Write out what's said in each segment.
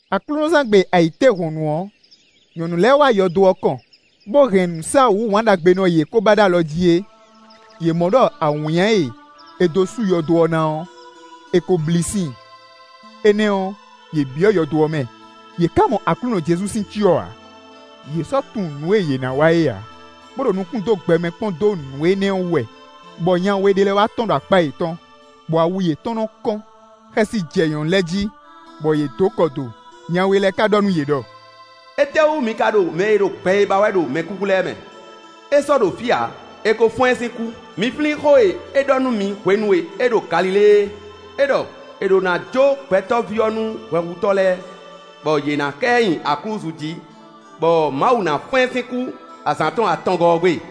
Aklúnɔzán gbe ayǐtéhɔ̌nnu ɔ́, nyɔ̌nu lɛ́ɛ wá yɔdo ɔ́ kɔn, bó hɛn nǔsáwǔ wǎnɖagbenɔ e yě ko ba ɖó alɔ jí é. Yě mɔ ɖɔ awǐnnya e è dó sú yɔdo ɔ́ ná ɔ́, è ko blí sín i. Énɛ́ ɔ́, yě byɔ́ yɔdo ɔ́ mɛ, yě ká mɔ Aklúnɔ Jezu sín cyɔ ǎ. Yě sɔ́ tunwun nǔ e yě ná wa é ǎ, bó ɖo nukún dó gbɛmɛ kpɔ́n dó nǔ énɛ́ wú wɛ, bɔ nya we ɖé lɛ́ɛ wá tɔ́n ɖo akpá yětɔn, bɔ awu yětɔn nɔ́ kɔ́n. Xɛsi jɛ nyɔ̌nu lɛ́ɛ jí, bɔ yě dǒ kɔ do; nya we lɛ́ɛ ká ɖɔ nú yě ɖɔ: “Étɛ́wú mi ka ɖo mɛ e ɖo gbɛ é ba wɛ ɖo mɛkúkú lɛ́ɛ mɛ? É sɔ́ ɖo fí ǎ, è ko fɔ́n ɛ sín kú. Mi flín xó e é ɖɔ nú mi hwenu e é ɖo Galilée é; é ɖɔ: ‘È ɖǒ ná jó Gbɛtɔ́ví ɔ́ nú hwɛhutɔ́ lɛ́ɛ, bɔ yě ná ká ɛ nyi aklúzu jí, bɔ Mawu ná fɔ́n ɛ sín kú azǎn tɔn atɔngɔ́ ɔ́ gbe.’”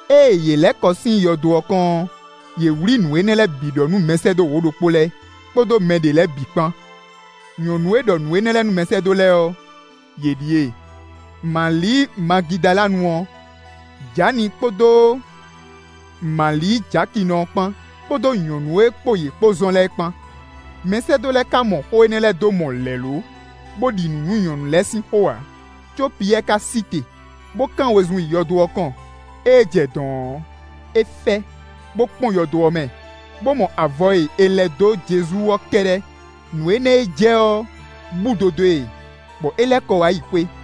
Ée yě lɛ́ kɔ sín yɔdo ɔ́ kɔn ɔ́, yě wlí nǔ énɛ́ lɛ́ɛ bǐ ɖɔ nú mɛsɛ́dó wǒ-ɖokpó lɛ́ɛ, kpódó mɛ ɖě lɛ́ɛ bǐ kpán. Nyɔ̌nu e ɖɔ nǔ énɛ́ lɛ́ɛ nú mɛsɛ́dó lɛ́ɛ ɔ́, yě ɖíe: Mali Magidalanu ɔ́, Jani kpódó Mali Jakinɔ ɔ́ kpán, kpódó nyɔ̌nu e kpó yě kpó zɔn lɛ́ɛ kpán. Mɛsɛ́dó lɛ́ɛ ka mɔ xó énɛ́ lɛ́ɛ dó mɔ lɛ̌lo, bó ɖi nǔ nú nyɔ̌nu lɛ́ɛ sín xó ǎ; có Piyɛ́ɛ ka sí te, bó kán wezun yi yɔdo ɔ́ kɔn. Ée é jɛ dɔ̌n ɔ́, é fɛ, bó kpɔ́n yɔdo ɔ́ mɛ, bó mɔ avɔ e è lɛ́ dó Jezu ɔ́ kɛ́ɖɛ́. Nǔ énɛ́ e jɛ ɔ́ búdo dó e, bɔ é lɛ́ kɔ wá yi xwé.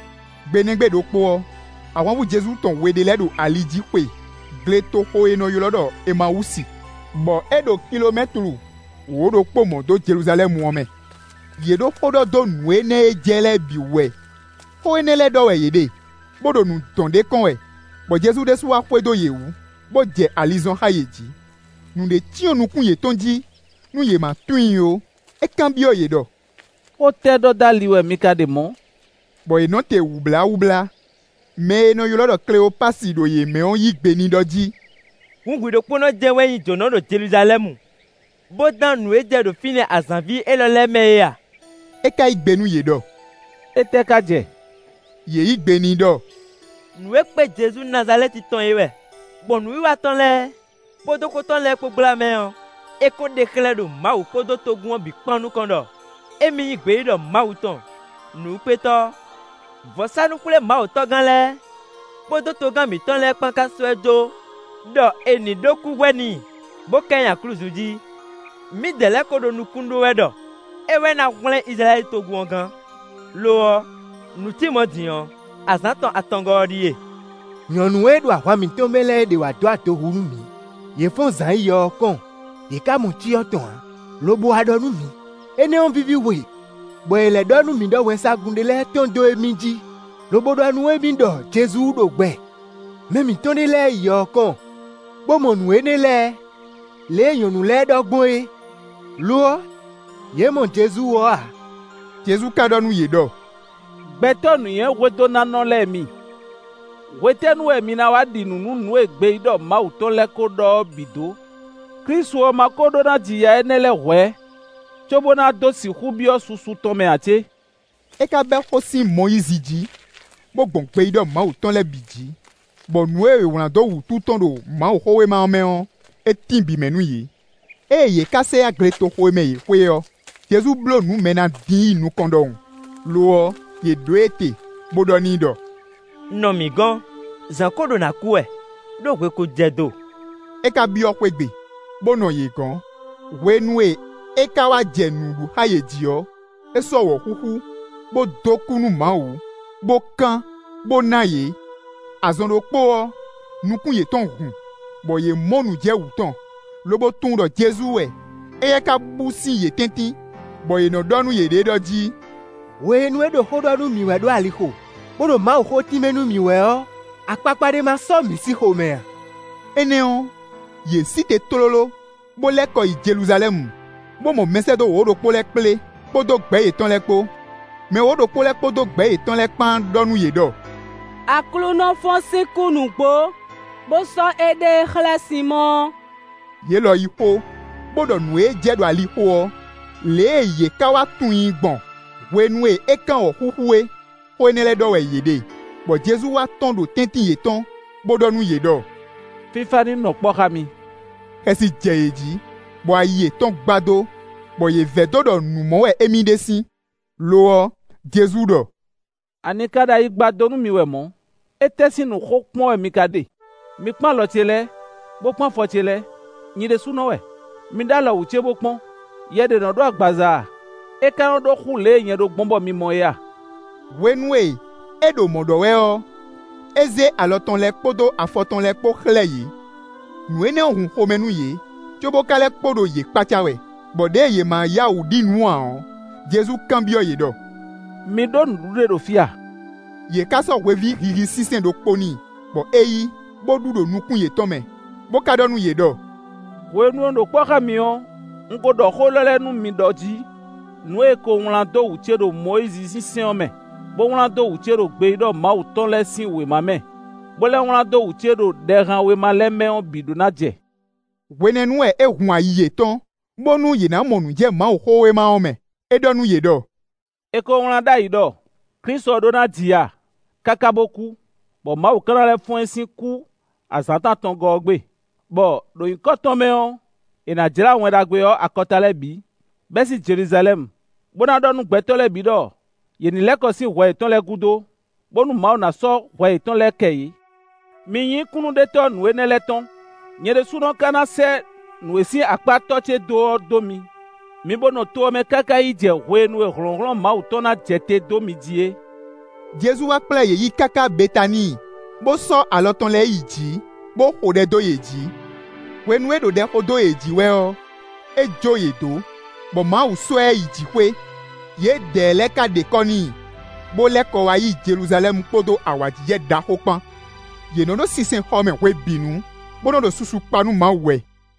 Gbe nɛ́ gbe ɖokpó ɔ́, ahwanvú Jezu tɔn we ɖé lɛ́ɛ ɖo ali jí xwe gletoxo e è nɔ ylɔ́ ɖɔ Emawúsi, bɔ é ɖo kilomɛ́tlu wǒ-ɖokpó mɔ̌ dó Jeluzalɛ́mu ɔ́ mɛ. Yě ɖo xó ɖɔ dó nǔ énɛ́ e jɛ lɛ́ɛ bǐ wú wɛ. Xó énɛ́ lɛ́ɛ ɖɔ wɛ yě ɖe, bó ɖo nǔ dɔn ɖ'é kɔn wɛ, bɔ Jezu ɖésú wá xwedó yě wú, bó jɛ ali zɔn xá yě jí. Nǔɖé cyɔ́n nukún yětɔn jí, nú yě ma tunwun i ó. É kanbyɔ́ yě ɖɔ: “Xó tɛ́ ɖɔ dó ali wɛ mi ka ɖe mɔ̌?” Bɔ yě nɔ te wǔbláwúblá. Mɛ e è nɔ ylɔ́ ɖɔ Kleopasi ɖo yě mɛ ɔ́ yí gbe n'i ɖɔ jí: “Hǔn hwi ɖokpónɔ jɛ́n wɛ nyí jǒnɔ ɖo Jeluzalɛ́mu bó dán nǔ e jɛ ɖo fínɛ́ azǎnví élɔ́ lɛ́ɛ mɛ é a?” É ka yí gbe nú yě ɖɔ: “Étɛ́ ka jɛ?” Yě yí gbe n'i ɖɔ: “Nǔ e kpé Jezu Nazalɛ́ti tɔn é wɛ. Gbɔn nǔwiwa tɔn lɛ́ɛ kpódó xó tɔn lɛ́ɛ kpó gbla mɛ ɔ́, é ko ɖe xlɛ́ ɖo Mawu kpódó togun ɔ́ bǐ kpán nukɔn ɖɔ émí nyí gbeyíɖɔ Mawu tɔn, nǔwúkpétɔ́. Vɔ̌sánú-xwlémawutɔ́gán lɛ́ɛ kpódó togán mǐtɔn lɛ́ɛ kpán ka sɔ́ ɛ jó ɖɔ è nǐ ɖó kúhwɛ n'i, bó ká ɛ nyi aklúzu jí. Mǐdɛɛ lɛ́ɛ kó ɖo nukún ɖó wɛ ɖɔ é wɛ ná hwlɛ́n Izlayɛ́li togun ɔ́ gán. Lo ɔ́, nǔ cí mɔ̌ din ɔ́, azǎn tɔn atɔngɔ́ ɔ́ ɖíe. Nyɔ̌nu e ɖo ahwan mǐtɔn mɛ lɛ́ɛ ɖěe wá dó adohu nú mǐ; yě fɔ́n zǎn yi yɔ ɔ́ kɔn, yě ká mɔ cyɔ tɔn ǎ, lobo wá ɖɔ nú mǐ; énɛ́ ɔ́ víví hwe, bɔ yě lɛ́ ɖɔ nú mǐ ɖɔ wɛnsagun ɖé lɛ́ɛ tɔ́n dó émí jí, lobo ɖɔ nú émí ɖɔ Jezu ɖo gbɛ. Mɛ mǐtɔn ɖé lɛ́ɛ yi yɔ ɔ́ kɔn, bó mɔ nǔ énɛ́ lɛ́ɛ, lě e nyɔ̌nu lɛ́ɛ ɖɔ gbɔn é; lo ɔ́, yě mɔ Jezu ɔ́ ǎ.” Jezu ka ɖɔ nú yě ɖɔ: “Gbɛtɔ́ nǔnywɛ́hwedónánɔ lɛ́ɛ mi! Hwetɛ́nu wɛ mi ná wá ɖi nǔ nú nǔ e gbeyíɖɔ Mawu tɔn lɛ́ɛ kó ɖɔ ɔ́ bǐ dó? Klísu ɔ́ má kó ɖó ná ji ya énɛ́ lɛ́ɛ hwɛ̌, cóbó ná dó sixú byɔ́ susu tɔn mɛ ǎ cé?” É ka bɛ́ xó sín Mɔyízi jí, bó gbɔn gbeyíɖɔ Mawu tɔn lɛ́ɛ bǐ jí, bɔ nǔ e è wlǎn dó wǔtu tɔn ɖo Mawuxówéma mɛ ɔ́, é tín bǐ mɛ nú yě. Ée yě ká sɛ yá gletoxo e mɛ yě xwe ɔ́, Jezu bló nǔ mɛ e ná dín yi nukɔn ɖɔhun; lo ɔ́, yě ɖó e te, bó ɖɔ n'i ɖɔ: “Nɔ mǐ gɔ̌n, zǎn kó ɖo nǎ kú wɛ, ɖó hwe kó jɛ do.” É ka byɔ́ xwé gbe, bó nɔ yě gɔ̌n. Hwenu e é ka wá jɛ nǔ ɖu xá yě jí ɔ́, é sɔ́ wɔ̌xúxú, bó dó kú nú Mawu, bó kán, bó ná yě. Azɔn ɖokpó ɔ́, nukún yětɔn hun, bɔ yě mɔ nǔ jɛ wǔ tɔn, lobo tunwun ɖɔ Jezu wɛ; éyɛ́ ka bú sín yě tɛ́ntin, bɔ yě nɔ ɖɔ nú yěɖée ɖɔ jí: “Hwenu e é ɖo xó ɖɔ nú mǐ wɛ ɖo alixo, bó ɖo Mawuxó tínmɛ nú mǐ wɛ ɔ́, akpakpa ɖé ma sɔ́ mǐ sín xomɛ a?” Énɛ́ ɔ́, yě sí te tlóló, bó lɛ́ kɔ yi Jeluzalɛ́mu, bó mɔ mɛsɛ́dó wǒ-ɖokpó lɛ́ɛ kplé, kpódó gbɛ̌ yětɔn lɛ́ɛ kpó. Mɛ wǒ-ɖokpó lɛ́ɛ kpódó gbɛ̌ yětɔn lɛ́ɛ kpán ɖɔ nú yě ɖɔ: “Aklúnɔ fɔ́n sín kú nǔgbó, bó sɔ́ éɖée xlɛ́ Sinmɔ́ɔ.” Yě lɔ yí xó, bó ɖɔ nǔ e jɛ ɖo alixo ɔ́, lě e yě ká wá tunwun i gbɔn hwenu e é kán wɔ̌xúxú é. Xó énɛ́ lɛ́ɛ ɖɔ wɛ yě ɖe, bɔ Jezu wá tɔ́n ɖo tɛ́ntin yětɔn, bó ɖɔ nú yě ɖɔ: “Fífá ní nɔ kpɔ́ xá mi.” Xɛsi jɛ yě jí, bɔ ayi yětɔn gbadó, bɔ yě vɛdó ɖɔ nǔ mɔ wɛ émí ɖe sín. Lo ɔ́, Jezu ɖɔ: “Ani ka ɖo ayi gbadó nú mi wɛ mɔ̌? Étɛ́ sín nǔ xo kpɔ́n wɛ mi ka ɖe? Mi kpɔ́n alɔ ce lɛ́ɛ, bó kpɔ́n afɔ ce lɛ́ɛ; nyi ɖésúnɔ wɛ. Mi ɖó alɔ wú ce bó kpɔ́n; yɛ ɖé nɔ ɖó agbaza ǎ, é ka nɔ ɖó xú lě e nyɛ ɖó gbɔn bɔ mi mɔ é ǎ.” Hwenu e é ɖo mɔ̌ ɖɔ wɛ ɔ́, é zé alɔ tɔn lɛ́ɛ kpódó afɔ tɔn lɛ́ɛ kpó xlɛ́ yě. Nǔ énɛ́ ɔ́ hun xomɛ nú yě, cóbó ka lɛ́ kpo ɖo yě kpácá wɛ, bɔ ɖěe yě ma yá wǔ ɖi nǔ ǎ ɔ́, Jezu kanbyɔ́ yě ɖɔ: “Mi ɖó nǔɖuɖu ɖé ɖo fí a?” Yě ká sɔ́ hweví hihi sínsɛ́n ɖokpó n'i, bɔ é yí, bó ɖu ɖo nukún yětɔn mɛ, bó ka ɖɔ nú yě ɖɔ: “Hwenu e un ɖo kpɔ́ xá mi ɔ́, un ko ɖɔ xó élɔ́ lɛ́ɛ nú mi ɖɔ jí: nǔ e è ko wlán dó wú ce ɖo Mɔyízi sín sɛ́n ɔ́ mɛ, bó wlán dó wú ce ɖo gbeyíɖɔ Mawu tɔn lɛ́ɛ sín wěma mɛ, bó lɛ́ wlán dó wú ce ɖo Ɖɛhanwéma lɛ́ɛ mɛ ɔ́ bǐ ɖó ná jɛ.” Hwenɛ́nu wɛ é hun ayi yětɔn, bónú yě ná mɔ nǔ jɛ Mawuxówéma ɔ́ mɛ. É ɖɔ nú yě ɖɔ: “È ko wlán ɖ'ayǐ ɖɔ: Klísu ɔ́ ɖó ná ji ya, káká bó kú, bɔ Mawu ka na lɛ́ fɔ́n ɛ sín kú azǎn tɔn atɔngɔ́ ɔ́ gbe, bɔ, ɖo nyǐkɔ tɔn mɛ ɔ́, è nǎ jlá Wɛn Ɖagbe ɔ́ akɔta lɛ́ɛ bǐ, bɛ́ sín Jeluzalɛ́mu, bó ná ɖɔ nú gbɛtɔ́ lɛ́ɛ bǐ ɖɔ yě ní lɛ́ kɔ sín hwɛ yětɔn lɛ́ɛ gúdo, bónú Mawu ná sɔ́ hwɛ yětɔn lɛ́ɛ kɛ yě. Mi nyí kúnnuɖetɔ́ nǔ énɛ́ lɛ́ɛ tɔn. Nyɛ ɖésúnɔ ka ná sɛ́ nǔ e sín akpá tɔ́ ce dó ɔ́ dó mi. Mi bó nɔ to ɔ́ mɛ káká yi jɛ hwenu e hlɔ̌nhlɔ́n Mawu tɔn ná jɛ te dó mi jí é.” Jezu wá kplá yě yi káká Betaníi, bó sɔ́ alɔ tɔn lɛ́ɛ yi jǐ, bó xo ɖɛ dó yě jí. Hwenu e é ɖo ɖɛ xo dó yě jí wɛ ɔ́, é jó yě dó, bɔ Mawu sɔ́ ɛ yi jǐxwé. Yědɛɛ lɛ́ɛ ka ɖe kɔ́ n'i, bó lɛ́ kɔ wá yi Jeluzalɛ́mu kpódó awǎjijɛ ɖaxó kpán. Yě nɔ ɖo sinsɛnxɔ mɛ hwebǐnu, bó nɔ ɖo susu kpa nú Mawu wɛ.